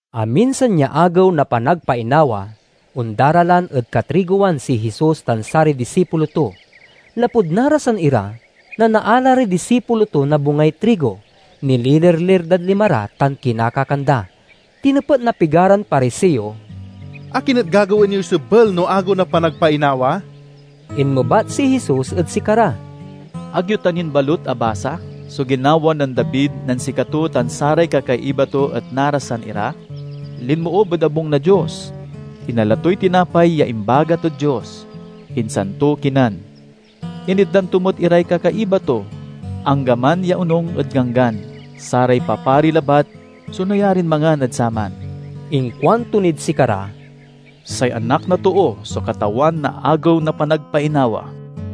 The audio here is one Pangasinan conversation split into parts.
Aminsan ya Agew na Panagpainawa, ondaralan ed katrigowan si Jesus tan saray disipulo to. Lapud narasan ira nanaala ray disipulo to na bungay trigo, nililirlir dad lima ra, tan kinakakan da. Tinepet na pigaran Pariseo, "Akin et gagawaen yoy sebel no Agew na Panagpainawa?" Inmebat si Jesus ed sikara, "Ag yo ta nin balut abasa so ginawa nen David nen sikato tan saray kakaiba to et narasan ira? Linmoob ed abung na Dios, inala toy tinapay ya imbagat ed Dios, insan to kinan. Initdan to met iray kakaiba to anggaman ya, onung ed Ganggan, saray papari labat so nayarin mangan ed saman." Inkuanto nid sikara, "Say Anak na Too so Katawan na Agew na Panagpainawa."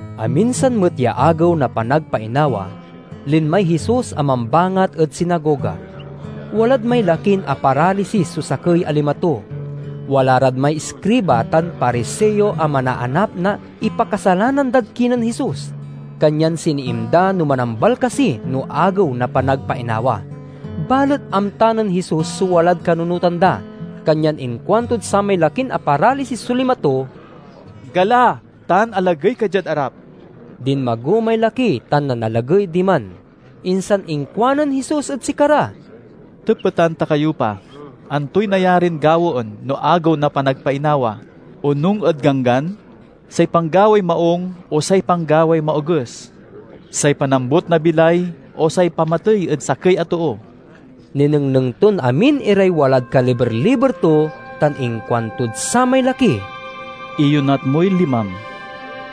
Aminsan met ya Agew na Panagpainawa, linmay Jesus a mambangat ed sinagoga. Walad may lakin aparalisis so sakey a lima to. Wala rad may iskriba tan Pariseo a manaanap na ipakasalanan dad kinen Jesus, kanyan siniim da no manambal kasi no Agew na Panagpainawa. Balet amta nen Jesus so walad kanunotan da, kanyan inkuantod samay lakin aparalisis so lima to, "Gala tan alagey ka diad arap." Dinmago may laki tan nanalagey diman. Insan inkuanen Jesus ed sikara, "Tepeten ta kayo pa: Antoy nayarin gawaen no Agew na Panagpainawa, onung ed Ganggan? Say panggaway maung, o say panggaway maoges? Say panambot na bilay o say pamatey ed sakey a too?" Ninengneng ton amin iray walad kaliber-liber to, tan inkuantod samay laki, "Iyonat moy limam!"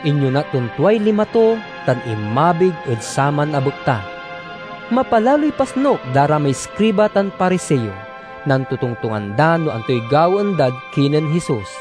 Inyonat ton tuay lima to, tan inmabig ed saman a bekta. Mapalaloy pasnuk da ra may iskriba tan Pariseo. Nantotongtongan da no antoy gawaen dad kinen Jesus.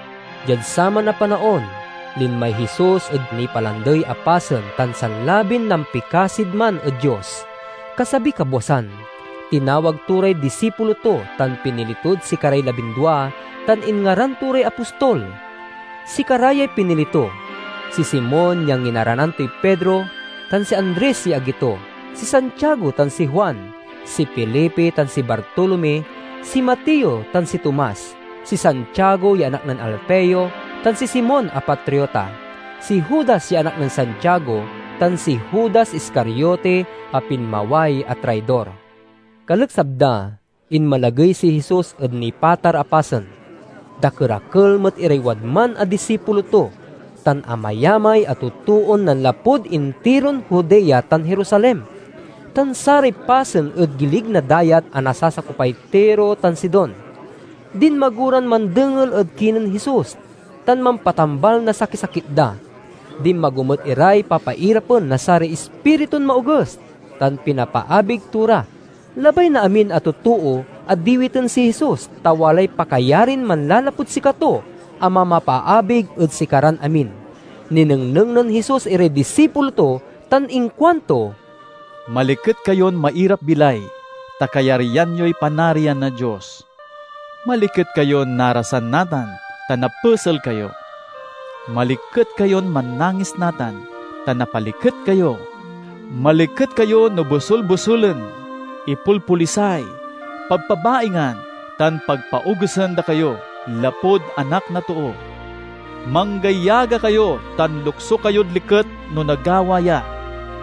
Diad saman a panaon, linmay Jesus ed nipalandey a pasen tan sanlabin nampikasid man ed Dios. Kasabiy kabwasan, tinawag to ray disipulo to, tan pinili tod sikaray labindua, tan inngaran to ray apostol. Sikara yay pinili to: si Simon ya nginaranan toy Pedro, tan si Andres ya agi to; si Santiago tan si Juan, si Felipe tan si Bartolome, si Mateo tan si Tomas, si Santiago ya anak nen Alfeo tan si Simon a Patriota, si Judas ya anak nen Santiago, tan si Judas Iscariote a pinmaway a traidor. Kaleksab da, inmalagey si Jesus ed nipatar a pasen. Dakerakel met iray wadman a disipulo to, tan amayamay a totoon nanlapud intiron Judea tan Jerusalem, tan saray pasen ed gilig na dayat a nasasakopay Tiro tan Sidon. Dinmago ran mandengel ed kinen Jesus tan mampatambal na sakisakit da. Dinmago met iray papairapen na saray ispiritun maoges, tan pinapaabig to ra. Labay na amin a totoo a diwiten si Jesus, ta walay pakayarin manlalapud sikato a mamapaabig ed sikaran amin. Ninengneng nen Jesus iray disipulo to tan inkuanto: "Maliket kayon mairap-bilay, ta kayaryan yoy Panarian na Dios! "Maliket kayon narasan natan, ta napesel kayo! Maliket kayon mannangis natan, ta napaliket kayo! "Maliket kayo no bosul-bosulen, ipolpolisay, pabpabaingan, tan pagpaogesen da kayo, lapud Anak na Too! Manggayaga kayo tan lukso kayod liket no nagawa ya,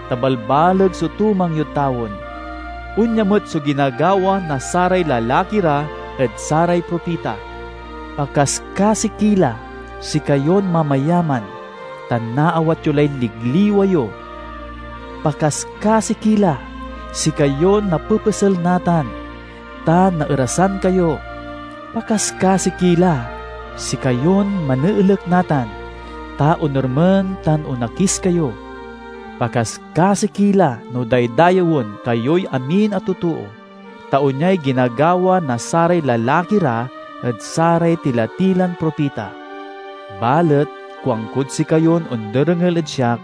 ta balbaleg so tumang yod tawen. Onya met so ginagawa na saray lalaki ra ed saray propita. "Pakaskasi ki la, sikayon mamayaman, ta naawat yo lay ligliwa yo! "Pakaskasi ki la, sikayon napepesel natan, ta naerasan kayo! Pakaskasi ki la, sikayon maneelek natan, ta onermen tan onakis kayo! "Pakaskasi ki la no daydayewen kayoy amin a totoo, ta onyay ginagawa na saray lalaki ra ed saray tila-tilan propita." "Balet kuankod sikayon onderengel ed siak: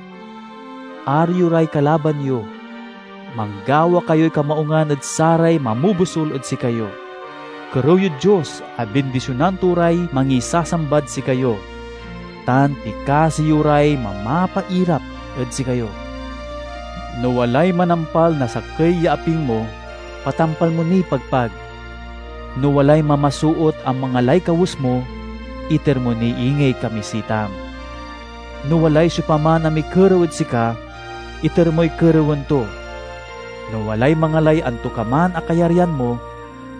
Aro yo ray kalaban yo, manggawa kayoy kamaungan ed saray mamobosul ed sikayo, kerew yod Dios a bindisionan to ray mangisasambad sikayo, tan pikasi yo ray mamapairap ed sikayo. No walay manampal na sakey ya aping mo, patampal mo niy pagpag. No walay mamasoot a mangalay kawes mo, iter mo ni ingey kamisitam. No walay siopaman a mikerew ed sika, iter moy kerewen to. No walay mangalay antokaman a kayaryan mo,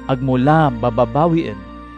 ag mo la bababawien.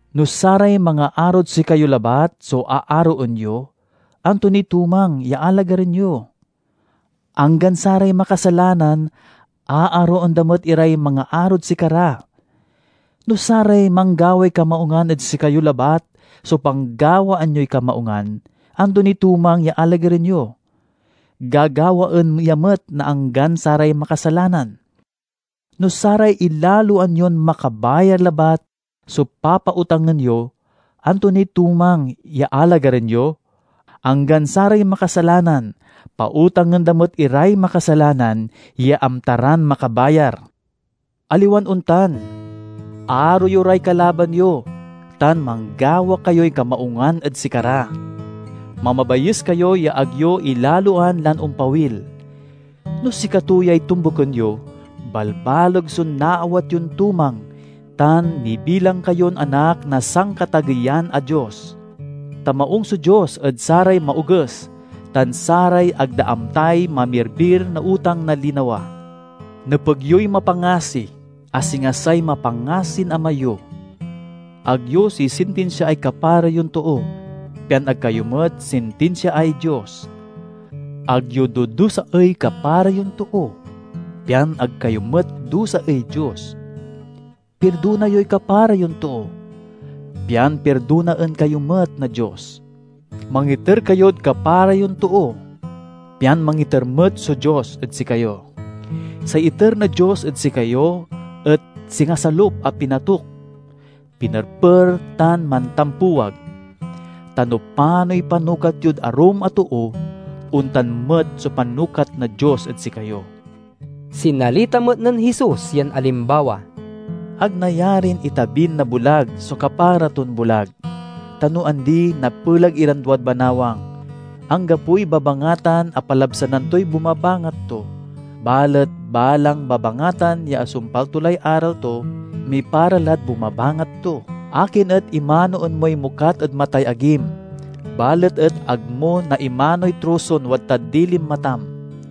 "No saray mangaarod sikayo labat so aaroen yo, anto niy tumang ya alagaren yo? Anggan saray makasalanan aaroen da met iray mangaarod sikara! No saray manggaway kamaungan ed sikayo labat so panggawaan yoy kamaungan, anto niy tumang ya alagaren yo? Gagawaen ya met na anggan saray makasalanan! No saray ilaloan yon makabayar labat so papautangen yo, anto niy tumang ya alagaren yo? Anggan saray makasalanan pautangen da met iray makasalanan ya amta ran makabayar! Aliwan ontan! Aro yo ray kalaban yo, tan manggawa kayoy kamaungan ed sikara. Mamabayes kayo ya ag yo ilaloan lan ompawil. No sikato yay tombuken yo, balbaleg so naawat yon tumang tan nibilang kayon anak na Sankatageyan a Dios. Ta maung so Dios ed saray maoges tan saray ag da amtay mamirbir na utang na linawa. Nepeg yoy mapangasi, a singa say mapangasin Ama yo." "Ag yo sisintinsiaay kapara yon too, pian ag kayo met sintinsiaay Dios. Ag yo dudusaey kapara yon too, pian ag kayo met dusaey Dios. Pirdona yoy kapara yon too, pian pirdonaen kayo met na Dios. Mangiter kayod kapara yon too, pian mangiter met so Dios ed sikayo. Say iter na Dios ed sikayo et singa salup a pinatuk, pinerper tan mantampuwag. Ta no panoy panukat yod arum a too, ontan met so panukat na Dios ed sikayo." Sinalita met nen Jesus yan alimbawa, "Ag nayarin itabin na bulag so kapara ton bulag, ta no andi napelag iran duad banawang. Anggapoy babangatan a palabsanan toy bumabangat to. Balet balang babangatan ya asumpal to lay aral to, mipara lad bumabangat to. "Akin et imanoen moy mokat ed matay agim, balet et ag mo naimanoy troson wadtad dilin matam?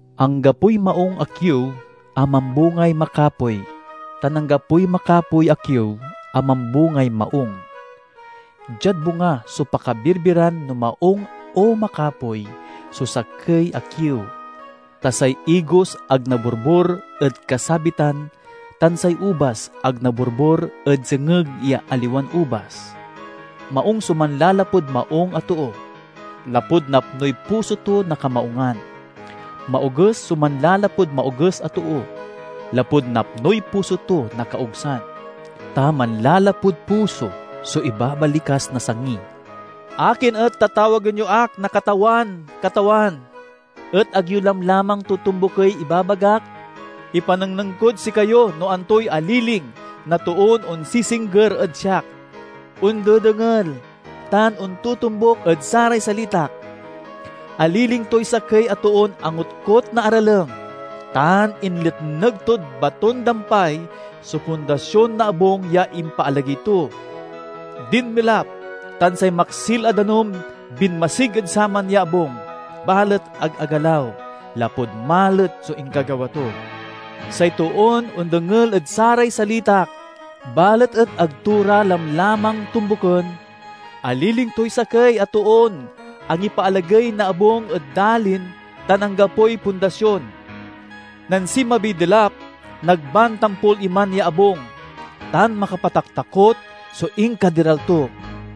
"Anggapoy maung a kiew a mambungay makapoy, tan anggapoy makapoy a kiew a mambungay maung. Diad bunga so pakabirbiran no maung o makapoy so sakey a kiew. Ta say igos ag naborbor ed kasabitan, tan say ubas ag naborbor ed sengeg ya aliwan ubas. Maung so manlalapud maung a too, lapud napnoy puso to na kamaungan. Maoges so manlalapud maoges a too, lapud napnoy puso to na kaogsan. Ta manlalapud puso so ibabalikas na sangi." "Akin et tatawagen yo ak na 'Katawan, Katawan!' et ag yo lamlamang totombukey ibabagak? Ipanengneng kod sikayo no antoy aliling na toon onsisingger ed siak, ondedengel, tan ontotombuk ed saray salitak. Aliling toy sakey a toon angotkot na aralem, tan inletneg tod baton-dampay so pundasion na abung ya impaalagey to. Dinmelap, tan say maksil a danum binmasig ed saman ya abung, balet ag agalaw, lapud malet so inkagawa to. Say toon ondengel ed saray salitak, balet et ag to ra lamlamang tombuken, aliling toy sakey a toon angipaalagey na abung ed dalin tan anggapoy pundasion. Nen sinmabiy delap, nagban tampol iman ya abung, tan makapataktakot so inkaderal to!"